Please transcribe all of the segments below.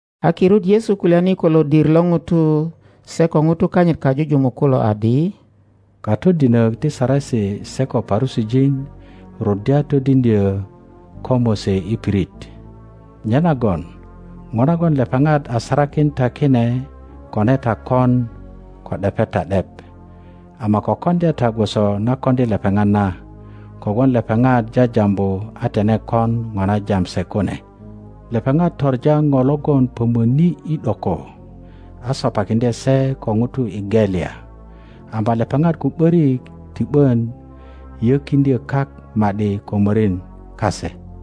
A kirut Yesu kulyani ko lodir lo ŋutu se ko ŋutu kanyit kajujumuk kulo adi, Katodinök ti Saresi se ko Parusijin ruddya todiŋdyö ko Mose i pirit. Nyenagon ŋo nagon lepeŋat a sarakin ta kine kone ta koŋ ko ’depe ta ’dep; ama ko koŋdya ta gwoso na koŋdi lepeŋat na, kogwon lepeŋat jajambu a tine kon ŋo na jam se kune. Lepeŋat toŋa ŋo logon pömöni i ’doko, a sopakiŋdye se ko ŋutu i gelya, ama lepeŋat ko ’börik ti ’bön yökiŋdyö kak ma ’di ko morin kase.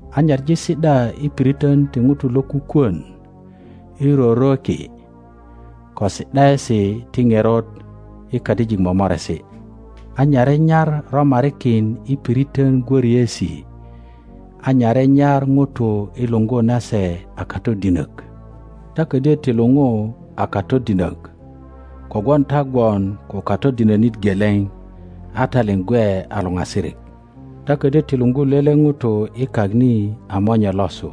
a nyaŋi si ’da i piritön ti ŋutu lo kukwön i rorweki, ko si ’daesi ti ŋerot i kadijik momoresi, a nyare nyar romarikin i piritön gwöriesi, a nyare nyar ŋutu i luŋgu na se a Katodinök. Ta ködyo ti luŋu a Katodinök, kogwon ta gwon ko Katodinönit geleŋ, a ta liŋ gwe a luŋasirik. Ta ködyö ti luŋgu lele ŋuto i kak ni a monye losu,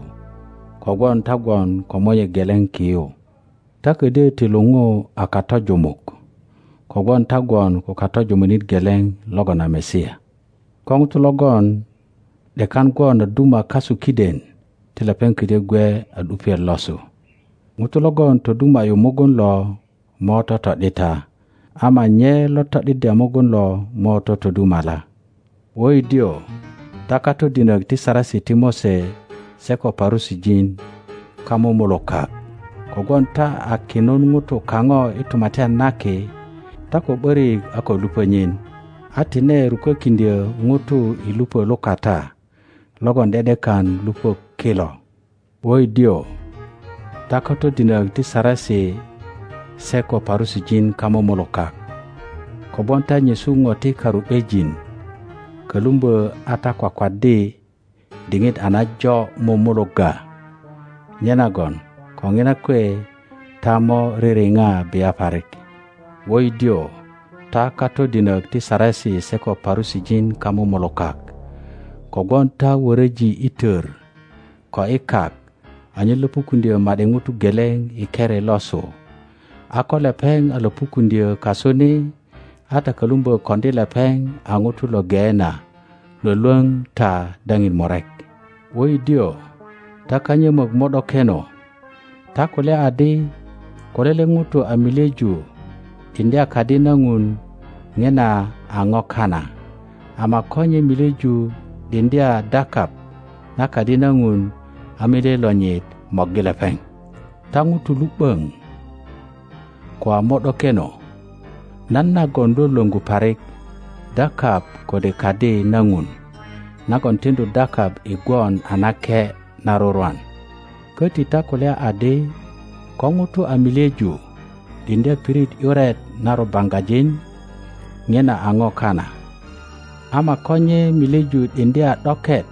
kogwon ta gwon ko Monye geleŋ ki yu. Ta ködyö ti luŋu a katojumuk, kogwon ta gwon ko Katojumunit geleŋ logon a Masia. Ko ŋuto logon ’dekan gwon a duma kasu kiden ti lepeŋ ködyö gwe a ’dupiet losu; ŋuto logon toduma ’yu mugun lo mo toto ’dita, ama nye lo to ’diddya mugun lo mo totodumala. Wöidiö, ta katodinök ti Saresi ti Mose se ko Parusijin, kamumulukak! Kogwon ta a kinun ŋutu kaŋo i Tumatyan na Ki; ta ko ’börik a ko lupö nyin, a tine rukökiŋdyö ŋutu i lupö lukata logon ’de ’dekan lupö kilo. [ Wöidiö, ta katodinök ti Saresi se ko Parusijin, kamumulukak! Kogwon ta nyesu ŋo ti karu ’bejin, kölumbö a ta kwakwaddi diŋit a najo mumulugga. Nyenagön ko ŋina kwe ta mo ririŋa bia parik.] Wöidiö, ta katodinök ti Saresi se ko Parusijin, kamumulukak! Kogwon ta wöröji i tör ko i kak anyen löpukuŋdyö ma ’di ŋuto geleŋ i keri losu; a ko lepeŋ a löpukuŋdyö kasu ni, a ta kölumbö koŋdi lepeŋ a ŋuto lo Geena lwölwöŋ ta daŋin murek. Wöidiö, ta kanyömök mo ’dokeno! Ta kulya adi, Ko lele ŋuto a milyeju ’diŋdya Kadi na Ŋun, ŋina a ŋo kana; ama ko nye milyeju ’diŋdya dakap na Kadi na Ŋun, a milye lonyit morgi lepeŋ. Ta ŋutu lu ’böŋ ko a mo ’dokeno! Nan nagon lwölwöŋgu parik, dakap kode Kadi na Ŋun nagon tiŋdu dakap i gwon a nake na rurwan? Köti ta kulya adi, Ko ŋuto a milyeju ’diŋdya pirit ’yuret na rubaŋgajin, ŋina a ŋo kana; ama ko nye milyeju ’diŋdya ’doket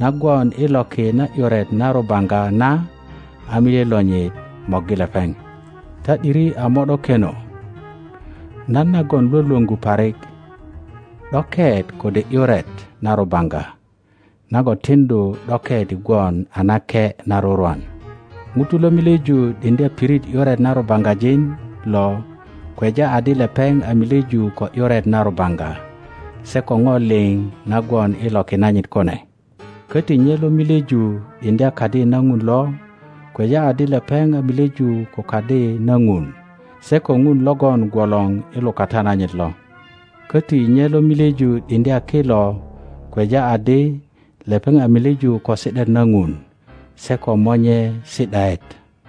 na gwon i loki na ’yuret na rubaŋga na, a milye lonyit morgi lepeŋ. Ta ’diri a mo ’dokeno! Nan nagon lwölwöŋgu parik, ’doket kode ’yuret na rubaŋga nagon tiŋdu ’doket i gwon a nake na rurwan? Ŋuto lo milyeju ’diŋdya pirit ’yuret na rubaŋgajin lo kweja adi lepeŋ a milyeju ko ’yuret na rubaŋga se ko ŋo liŋ na gwon i loki nanyit kune. Köti nye lo milyeju ’diŋdya Kadi na Ŋun lo kweja adi lepeŋ a milyeju ko Kadi na Ŋun se ko Ŋun logon gwolor i lukata nanyit lo. Köti nye lo milyeju ’diŋdya ki lo kweja adi lepeŋ a milyeju ko si ’daet na Ŋun, se ko Monye si ’daet.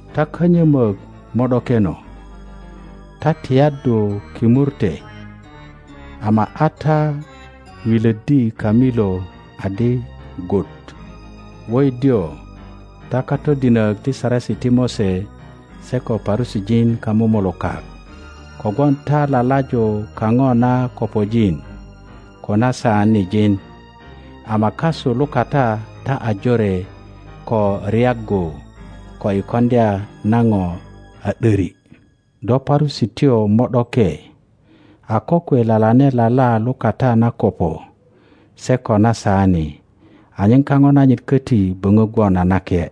Ta kanyömök mo ’dokeno! Ta tiyaddu kimurte, ama a ta wilöddi kamilo adi gut! Wöidiö, ta katodinök ti Saresi ti Mose se ko Parusijin, kamumulukak! Kogwon ta lalaju kaŋo na kopojin ko na saan ŋin, ama kasu lukata ta a jore ko ryaggu ko i koŋdya na ŋo a ’döri. Do Parusityo mo ’doke! A kokwe lalane lala lukata na kopo se ko na saani, anyen kaŋo nanyit köti böŋö gwon a nake.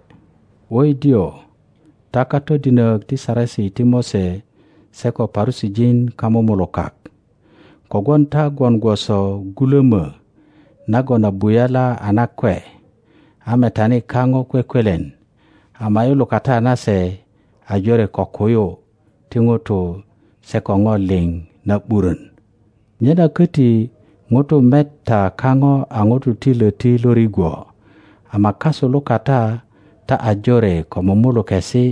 Wöidiö, ta katodinök ti Saresi ti Mose se ko Parusijin, kamumulukak! Kogwon ta gwon gwoso gulömö nagon a buyala a nakwe, a metani kaŋo kwekwelen, ama i lukata nase a jore ko kuyu ti ŋutu se ko ŋo liŋ na ’burön. Nyena köti ŋutu met ta kaŋo a ŋutu ti löti lo rigwo, ama kasu lukata taajoreko mumulukesi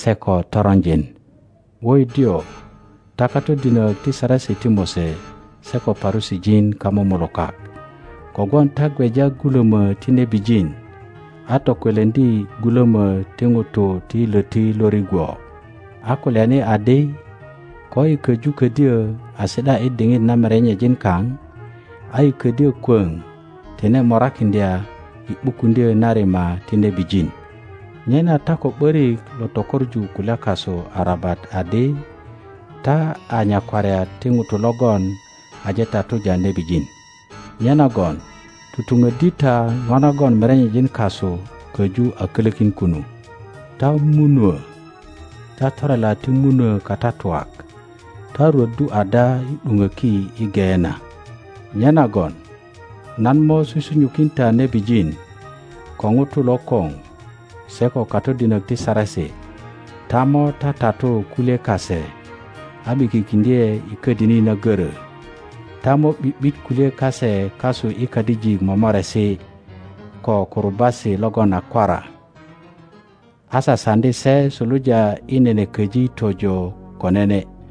se ko toronjin. Wöidiö, ta katodinök ti Saresi ti Mose se ko Parusijin, kamumulukak! Kogwon ta gweja gulömö ti nebijin, a tokweleŋdi gulömö ti ŋutu ti löti lo rigwo, a kulyani adi, Koyi köju ködyö a si ’da i diŋit na merenyejin kaŋ, a yi ködyö kwöŋ tine morakiŋdya i ’bukuŋdyö na rima ti nebijin. Nyena ta ko ’börik lo tökoŋu kulya kasu arabat adi, ta a nyakwariat ti ŋutu logon aje tatuja nebijin. Nyenagon tutuŋöddi ta ŋo nagon merenyejin kasu köju a kölökin kunu. Ta munuö, ta torela ti munuö katatuak, ta rwöddu ada i ’duŋöki i Geena? Nyenagon nan mo susunyukin ta nebijin, ko ŋutu lokoŋ, se ko katodinök ti Saresi. Ta mo tatatu kulye kase a ’bikikiŋdye i ködini na görö; ta mo ’bi ’bit kulye kase kasu i kadijik momoresi ko kurubasi logon a kwara, a sasaŋdi se suluja i nene köji tojo ko nene;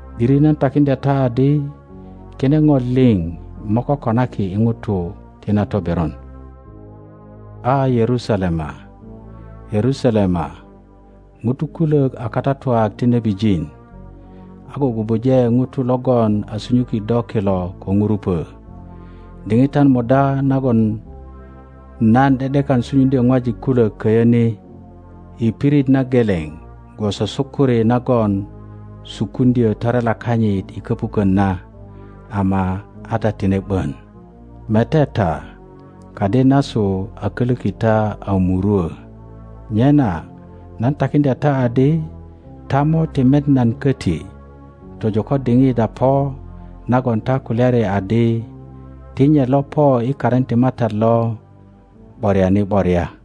’Diri nan takiŋdya ta adi, kine ŋo liŋ mo kokonaki i ŋutu ti na toberon. A, Yerusalema, Yerusalema, ŋutu kulök a katatuak ti nebijin, a gugubuje ŋutu logon a sunyuki do kilo ko ŋurupö! Diŋitan muda nagon nan ’de ’dekan sukuŋdyö ŋwajik kulök köyö ni i pirit na geleŋ gwoso sukuri nagon sukuŋdyö torela kanyit i köpukön na, ama a ta tine ’bön! Mete ta, kadi nasu a kölöki ta a murwö. Nyena nan takiŋdya ta adi, ta mo ti met nan köti tojo ko diŋit a po nagon ta kulyari adi, Ti nye lo po i karin ti MATAT lo ’boriani ’boria.